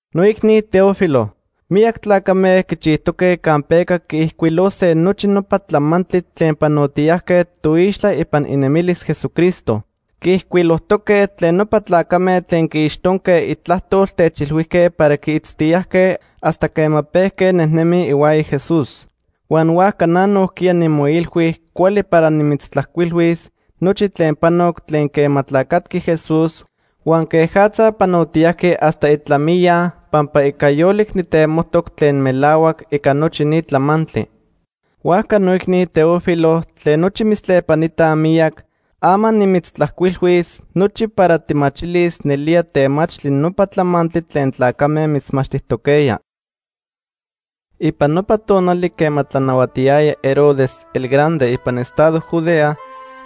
Noicni Teófilo, miyac tlacame quichijtoque campeca quiijcuilose nochi nopa tlamantli tlen panotiyajque toixtla ipan inemilis Jesucristo. Quiijcuilojtoque tlen nopa tlacame tlen quiixtonque itlajtol techilhuijque para quiitztiyajque hasta quema pejque nejnemij ihuaya Jesús. Huan huajca na nojquiya nimoilhui cuali para nimitztlajcuilhuis nochi tlen panoc tlen quema tlacatqui Jesús huan quejatza panotiyajqui hasta itlamiya pampa ica yolic nijtemojtoc tlen melahuac ica nochi ni tlamantli. Huajca noicni Teófilo tlen nochi mitztlepanitaj miyac, ama nimitztlajcuilhuis nochi para tijmachilis nelía temachtli nopa tlamantli tlen tlacame mitzmachtijtoquejya. Ipan nopa tonali quema tlanahuatiyaya Herodes el Grande ipan estado Judea,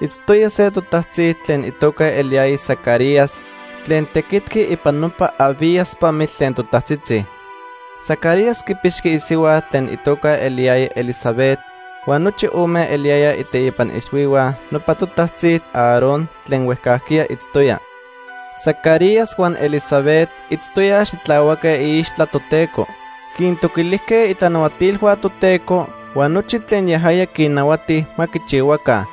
itztoya se totajtzi tlen itoca eliyaya Zacarías tlen tequitqui ipan nopa Abías pamitl tlen totajtzitzi. Zacarías quipixqui isihua tlen itoca eliyaya Elisabet huan nochi ome eliyayaj iteipa ixhuihua nopa totajtzi Aarón tlen huejcajquiya itztoya. Zacarías huan Elisabet itztoyaj xitlahuaque iixtla Toteco. Quintoquilijque itlanahuatilhua Toteco huan nochi tlen yajaya quinnahuati ma quichihuaca.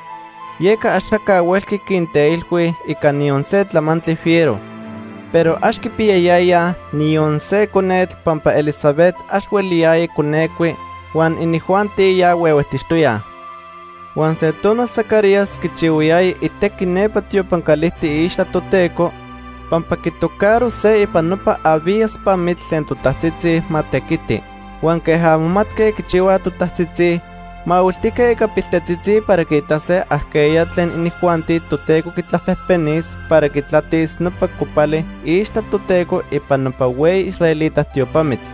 Yeca axaca huelqui quinteilhui ica niyon se tlamantli fiero. Pero ax quipiyayayaj niyon se conetl pampa Elisabet ax hueliyaya conecui huan inijuanti ya huehuejtixtoyaj. Huan se tonal Zacarías quichihuayaya itequi nepa tiopan calijtic iixtla Toteco, pampa quitocaro se ipan nopa Abías pamitl tlen totajtzitzi ma tequiti. Huan queja momatque quichihuaj totajtzitzi, mahuiltijque ica piltetzitzi para quiitase ajqueya tlen inijuanti Toteco quitlapejpenis para quitlatis nopa copali iixtla Toteco ipan nopa hueyi israelita tiopamitl.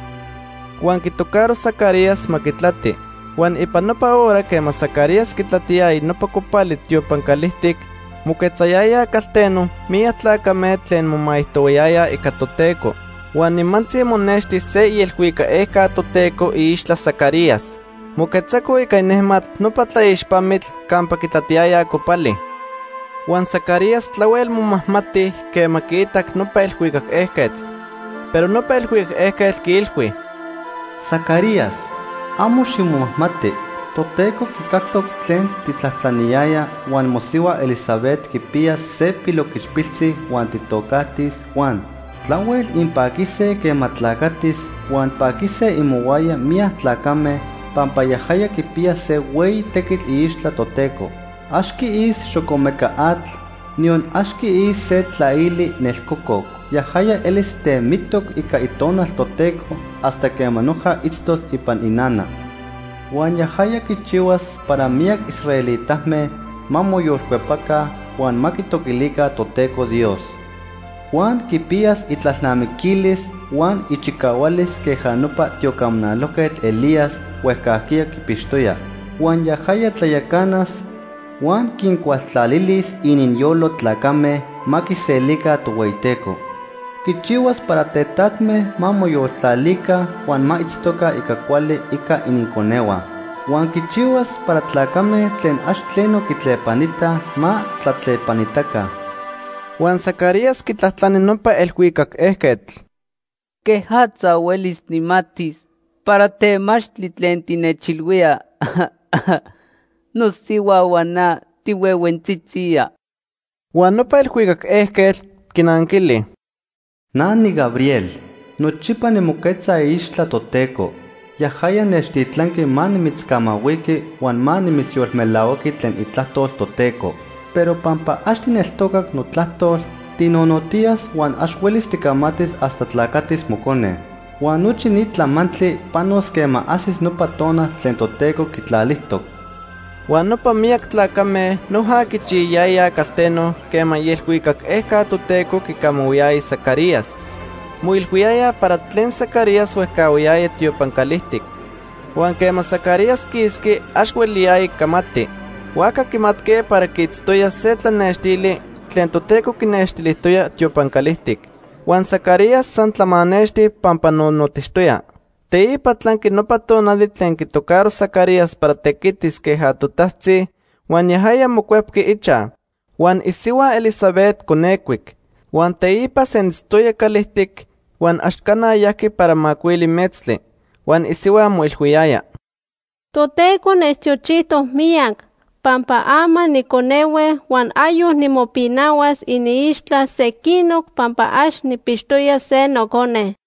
Huan quitocaro Zacarías ma quitlati. Huan ipan nopa hora quema Zacarías quitlatiyaya nopa copali tiopan calijtic, moquetzayayaj calteno miyac tlacame tlen momaijtohuayayaj ica Toteco. Huan nimantzi monexti se ielhuicac ejca Toteco iixtla Zacarías. Moquetzaco ica inejmatl nopa tlaixpamitl campa quitlatiyaya copali. Huan Zacarías tlahuel momajmati quema quiitac nopa elhuicac ejquetl. Pero nopa elhuicac ejquetl quiilhui: ―Zacarías, amo ximomajmati. Toteco quicactoc tlen tijtlajtlaniyaya, huan mosihua Elisabet quipiyas se piloquichpiltzi huan tijtocajtis Juan. Tlahuel inpaquise quema tlacatis huan paquise imohuaya miyac tlacame, pampa yajaya quipiyas se hueyi tequitl iixtla Toteco. Ax quiis xocomeca atl, niyon ax quiis se tlaili nelcococ. Yajaya elis temitoc ica Itonal Toteco hasta quema noja itztos ipan inana. Huan yajaya quichihuas para miyac israelitame ma moyolcuepaca huan ma quitoquilica Toteco Dios. Juan quipiyas itlalnamiquilis huan ichicahualis queja nopa tiocamanalojquetl Elías huejcajquiya quipixtoya. Huan yajaya tlayacanas huan quincualtlalilis ininyolo tlacame ma quiselica Tohueyiteco. Quichihuas para tetatme ma moyoltlalica huan ma itztoca ica cuali ica ininconehua. Huan quichihuas para tlacame tlen ax tleno quitlepanitaj, ma tlatlepanitaca. Huan Zacarías quitlajtlani nopa elhuicac ejquetl: ―¿Quejatza huelis nijmatis para temachtli tlen tinechilhuía? Nosihua huan na tihuehuentzitzijya. Huan nopa elhuicac ejquetl quinanquili: ―Na niGabriel. Nochipa nimoquetza iixtla Toteco. Yajaya nechtitlanqui ma nimitzcamahuiqui huan ma nimitzyolmelahuaqui tlen itlajtol Toteco. Pero pampa ax tijneltocac notlajtol, tinonotiyas huan ax huelis ticamatis hasta tlacatis mocone. Huan nochi ni tlamantli panos quema ajsis nopa tonal tlen Toteco quitlalijtoc. Huan nopa miyac tlacame noja quichiyayayaj calteno quema ielhuicac ejca Toteco quicamahuiyaya Zacarías. Moilhuiyayaj para tlen Zacarías huejcahuayaya tiopan calijtic. Huan quema Zacarías quisqui, ax hueliyaya camati. Huajca quimatque para quiitztoya se tlanextili tlen Toteco quinextilijtoya tiopan calijtic. Huan Zacarías san tlamanexti pampa nonotixtoya. Teipa tlanqui nopa tonali tlen quitocaro Zacarías para tequitis queja totajtzi, huan yajaya mocuepqui ichaj. Huan isihua Elisabet conecuic. Huan teipa senitztoya calijtic huan ax cana yajqui para macuili metztli. Huan isihua moilhuiyaya: “Toteco nechtiochijtoc miyac, pampa ama niconehue huan ayoc nimopinahuas iniixtla sequinoc pampa ax nijpixtoya se nocone.”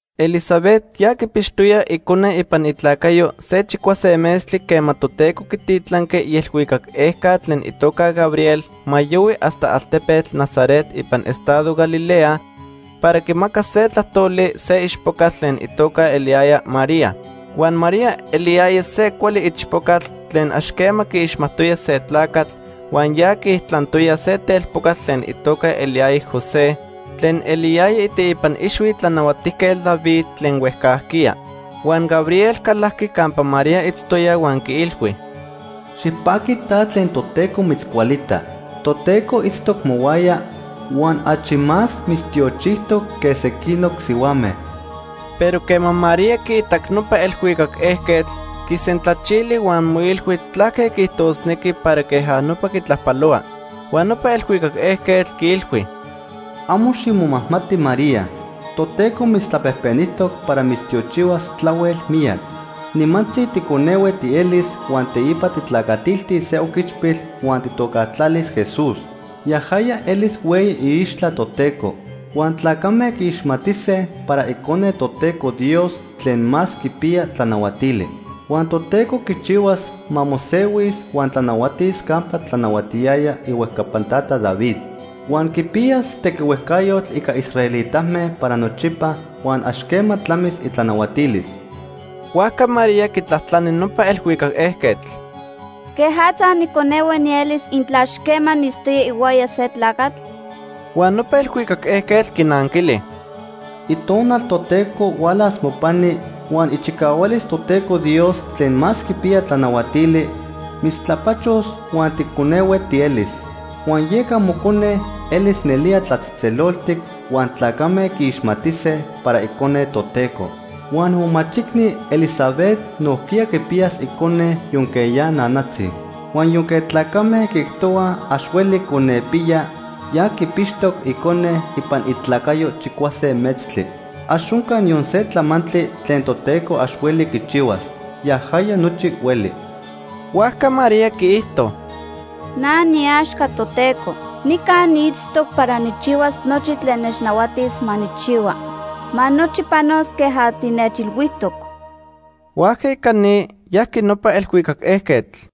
Elisabet ya quipixtoya icone ipan itlacayo se chicuase metztli quema Toteco quititlanqui ielhuicac ejca tlen itoca Gabriel ma yohui hasta altepetl Nazaret ipan estado Galilea para quimacas se tlajtoli se ichpocatl tlen itoca eliyaya María. Huan María eliyaya se cuali ichpocatl tlen ax quema quiixmajtoya se tlacatl huan ya quiijtlantoya se telpocatl tlen itoca eliyaya José tlen eliyaya iteipa ixhui Tlanahuatijquetl David tlen huejcajquiya. Huan Gabriel calajqui campa María itztoya huan quiilhui: ―Xipaqui ta tlen Toteco mitzcualita. Toteco itztoc mohuaya huan achi más mitztiochijtoc que sequinoc sihuame. Pero quema María quiitac nopa elhuicac ejquetl, quisentlachili huan moilhui tlaque quiijtosnequi para queja nopa quitlajpalohua. Huan nopa elhuicac ejquetl quiilhui: ―Amo ximomajmati María. Toteco mitztlapejpenijtoc para mitztiochihuas tlahuel miyac. Nimantzi ticonehue tielis huan teipa tijtlacatiltis se oquichpil huan tijtocajtlalis Jesús. Yajaya elis hueyi iixtla Toteco. Huan tlacame quiixmatise para Icone Toteco Dios Tlen Más Quipiya Tlanahuatili. Huan Toteco quichihuas ma mosehuis huan tlanahuatis campa tlanahuatiyaya ihuejcapan tata David. Huan quipiyas tequihuejcayotl ica israelitame para nochipa huan ax quema tlamis itlanahuatilis. Huajca María quitlajtlani nopa elhuicac ejquetl: ―¿Quejatza niconehue nielis intla ax quema niitztoya ihuaya se tlacatl? Huan nopa elhuicac ejquetl quinanquili: ―Itonal Toteco hualas mopani, huan ichicahualis Toteco Dios Tlen Más Quipiya Tlanahuatili mitztlapachos huan ticonehue tielis. Huan yeca mocone elis nelía tlatzejtzeloltic, huan tlacame quiixmatise para Icone Toteco. Huan momachicni Elisabet nojquiya quipiyas icone yonque ya nanatzi. Huan yonque tlacame quiijtohuaj ax hueli conepiya, ya quipixtoc icone ipan itlacayo chicuase metztli. Ax onca niyon se tlamantli tlen Toteco ax hueli quichihuas. Yajaya nochi hueli. Huajca María quiijto: ―Na niiaxca Toteco. Nica niitztoc para nijchihuas nochi tlen nechnahuatis ma nijchihua. Ma nochi panos queja tinechilhuijtoc. Huajca ica ni, yajqui nopa elhuicac ejquetl.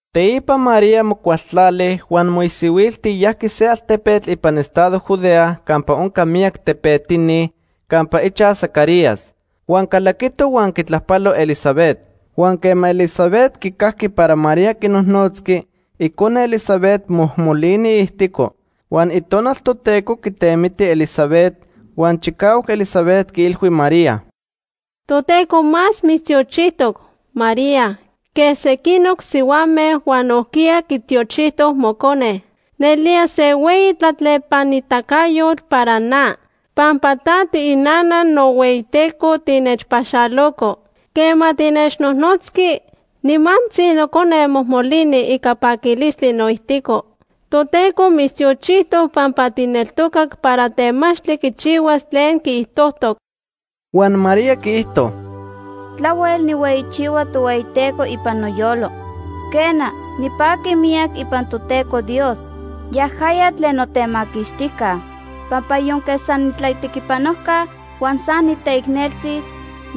Teipa María mocualtlali huan moisihuilti yajqui se altepetl ipan estado Judea campa onca miyac tepetini campa ichaj Zacarías. Huan calaquito huan quitlajpalo Elisabet. Huan quema Elisabet quicajqui para María quinojnotzqui, icone Elisabet mojmolini iijtico. Huan Itonal Toteco quitemiti Elisabet, huan chicahuac Elisabet quiilhui María: ―Toteco más mitztiochijtoc, María, que sequinoc sihuame huan nojquiya quitiochijtoc mocone. Nelía se hueyi tlatlepanitacayotl para na, pampa ta tiinana nohueyiTeco tinechpaxaloco. Quema tinechnojnotzqui, nimantzi nocone mojmolini ica paquilistli noijtico. Toteco mitztiochijtoc pampa tijneltocac para temachtli quichihuas tlen quiijtojtoc. Huan María quiijto: “Tlahuel nijhueyichihua Tohueyiteco ipan noyolo. Quena, nipaqui miyac ipan Toteco Dios, yajaya tlen notemaquixtijca. Pampa yonque san niitlatequipanojca, huan san niteicneltzi,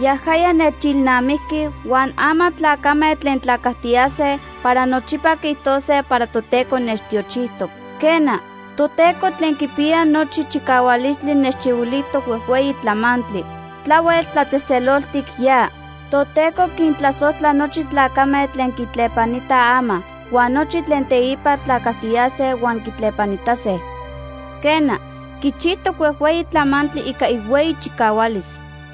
yajaya nechilnamijqui, huan ama tlacame tlen tlacajtiyase para nochipa quiijtose para Toteco nechtiochijtoc. Quena, Toteco Tlen Quipiya Nochi Chicahualistli nechchihuilijtoc huejhueyi tlamantli. Tlahuel tlatzejtzeloltic ya. Toteco quintlasojtla nochi tlacame tlen quitlepanitaj ama, huan nochi tlen teipa tlacajtiyase huan quitlepanitase. Quena, quichijtoc huejhueyi tlamantli ica ihueyi chicahualis.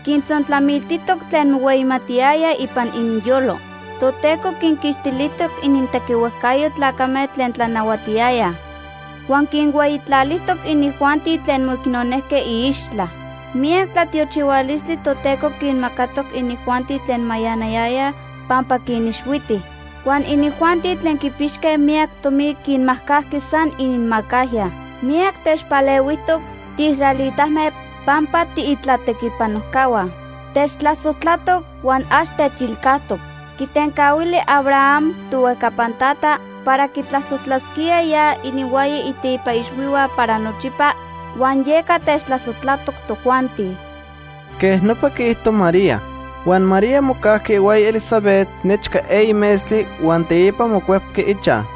Quintzontlamiltijtoc tlen mohueyimatiyayaj ipan ininyolo. Toteco quinquixtilijtoc inintequihuejcayo tlacame tlen tlanahuatiyayaj, huan quinhueyitlalijtoc inijuanti tlen moicnonejque iixtla. Miyac tlatiochihualistli Toteco quinmacatoc inijuanti tlen mayanayayaj, pampa quinixhuiti. Huan inijuanti tlen quipixque miyac tomi quinmajcajqui san ininmacajya. Miyac techpalehuijtoc tiisraelitame pampa tiitlatequipanojcahua. Techtlasojtlatoc huan ax techilcajtoc. Quitencahuili Abraham, tohuejcapan tata, para quitlasojtlasquía ya ininhuaya iteipa ixhuihua para nochipa, huan yeca techtlasojtlatoc tojuanti.” Quej nopa quiijto María. Huan María mocajqui ihuaya Elisabet nechca eyi metztli huan teipa mocuepqui ichaj.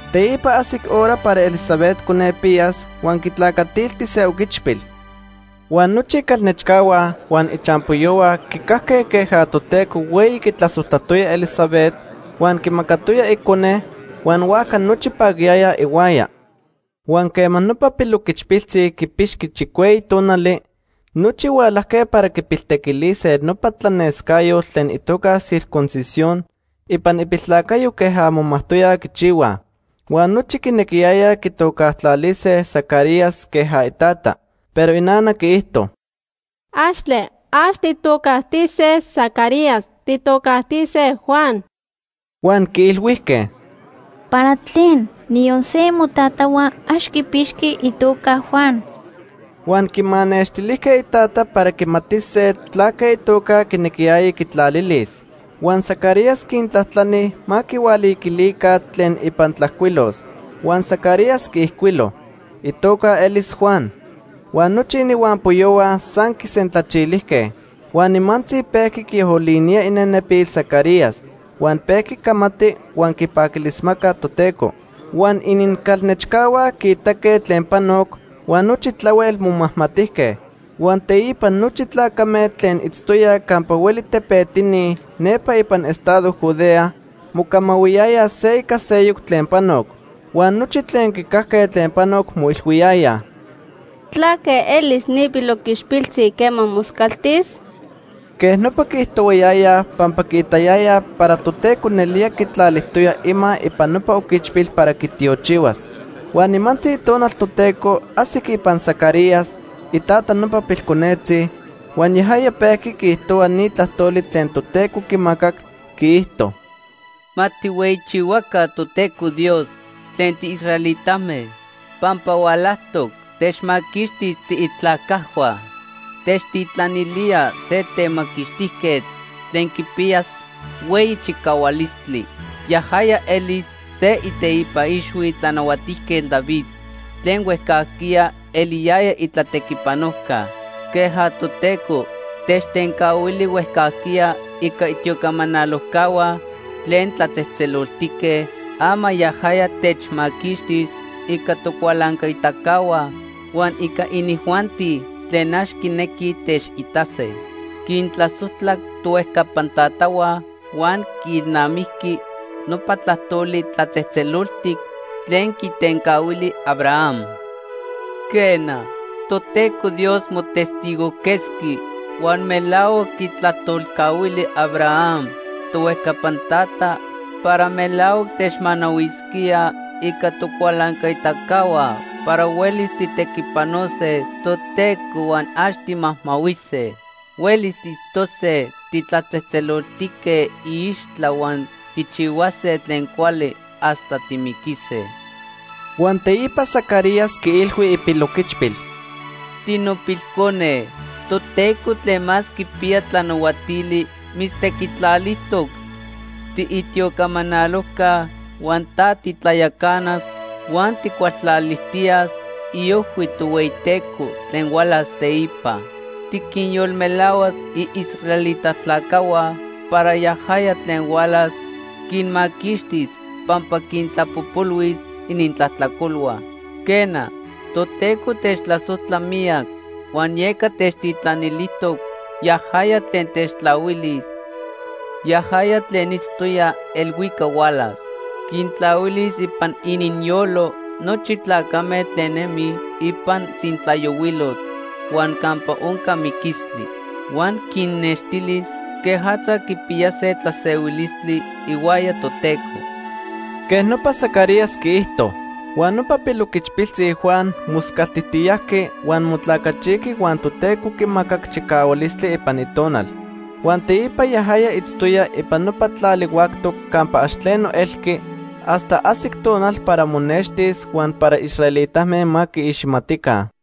Teipa ajsic hora para Elisabet conepiyas huan quitlacatilti se oquichpil. Huan nochi icalnechcahua huan ichampoyohua quicajque queja Toteco hueyi quitlasojtlatoya Elisabet huan quimacatoya icone huan huajca nochi paquiyayaj ihuaya. Huan quema nopa piloquichpiltzi quipixqui chicueyi tonali, nochi hualajque para quipiltequilise nopa tlanescayotl tlen itoca circuncisión ipan ipiltlacayo queja momajtoyaj quichihuaj. Huan nochi quinequiyayaj quitocajtlalise Zacarías queja itata. Pero inana quiijto: ―Axtle, ax tijtocajtise Zacarías, tijtocajtise Juan. Huan quiilhuijque: ―¿Para tlen? Niyon se imotatahua ax quipixqui itoca Juan. Huan quimanextilijque itata para quimatise tlaque itoca quinequiyaya quitlalilis. Huan Zacarías quintlajtlani ma quihualiquilica tlen ipan tlajcuilos. Huan Zacarías quiijcuilo: “Itoca elis Juan.” Huan nochi ininhuampoyohua san quisentlachilijque. Huan nimantzi pejqui quiolinía inenepil Zacarías, huan pejqui camati huan quipaquilismaca Toteco. Huan inincalnechcahua quiitaque tlen panoc, huan nochi tlahuel momajmatijque. Huan teipa nochi tlacame tlen itztoyaj campa hueli tepetini nepa ipan estado Judea mocamahuiyayaj se ica seyoc tlen panoc. Huan nochi tlen quicajque tlen panoc moilhuiyayaj: “¿Tlaque elis ni piloquichpiltzi quema moscaltis?” Quej nopa quiijtohuayayaj pampa quiitayayaj para Toteco nelía quitlalijtoya ima ipan nopa oquichpil para quitiochihuas. Huan nimantzi Itonal Toteco ajsic ipan Zacarías, itata nopa pilconetzi, huan yajaya pejqui quiijtohua ni tlajtoli tlen Toteco quimacac. Quiijto: “Ma tijhueyichihuaca Toteco Dios tlen tiisraelitame, pampa hualajtoc techmaquixtis tiitlacajhua. Techtitlanilía se Temaquixtijquetl tlen quipiyas hueyi chicahualistli. Yajaya elis se iteipa ixhui Tlanahuatijquetl David tlen huejcajquiya eliyaya itlatequipanojca. Queja Toteco techtencahuili huejcajquiya ica itiocamanalojcahua tlen tlatzejtzeloltique, ama yajaya techmaquixtis ica tocualancaitacahua huan ica inijuanti tlen ax quinequij techitase. Quintlasojtlac tohuejcapan tatahua, huan quiilnamijqui nopa tlajtoli tlatzejtzeloltic tlen quitencahuili Abraham. Quena, Toteco Dios motestigojquetzqui huan melahuac quitlajtolcahuili Abraham, tohuejcapan tata, para melahuac techmanahuisquía ica tocualancaitacahua para huelis tijtequipanose Toteco huan ax timajmahuise. Huelis tiitztose titlatzejtzeloltique iixtla huan tijchihuase tlen cuali hasta timiquise.” Huan teipa Zacarías quiilhui ipiloquichpil: “Tinopilcone, Toteco Tlen Más Quipiya Tlanahuatili mitztequitlalijtoc tiitiocamanalojca, huan ta titlayacanas huan tijcualtlalijtiyas iojhui Tohueyiteco tlen hualas teipa. Tiquinyolmelahuas iisraelita tlacajhua para yajaya tlen hualas quinmaquixtis, pampa quintlapojpolhuis inintlajtlacolhua. Quena, Toteco techtlasojtla miyac, huan yeca techtitlanilijtoc yajaya tlen techtlahuilis, yajaya tlen itztoya elhuicac hualas. Quintlahuilis ipan ininyolo nochi tlacame tlen nemij ipan tzintlayohuilotl huan campa onca miquistli. Huan quinnextilis quejatza quipiyase tlasehuilistli ihuaya Toteco.” Quej nopa Zacarías quiijto. Huan nopa piloquichpiltzi Juan moscaltijtiyajqui huan motlacachijqui huan Toteco quimacac chicahualistli ipan itonal. Huan teipa yajaya itztoya ipan nopa tlali huactoc campa ax tleno elqui hasta ajsic tonal para monextis huan para israelitame ma quiixmatica.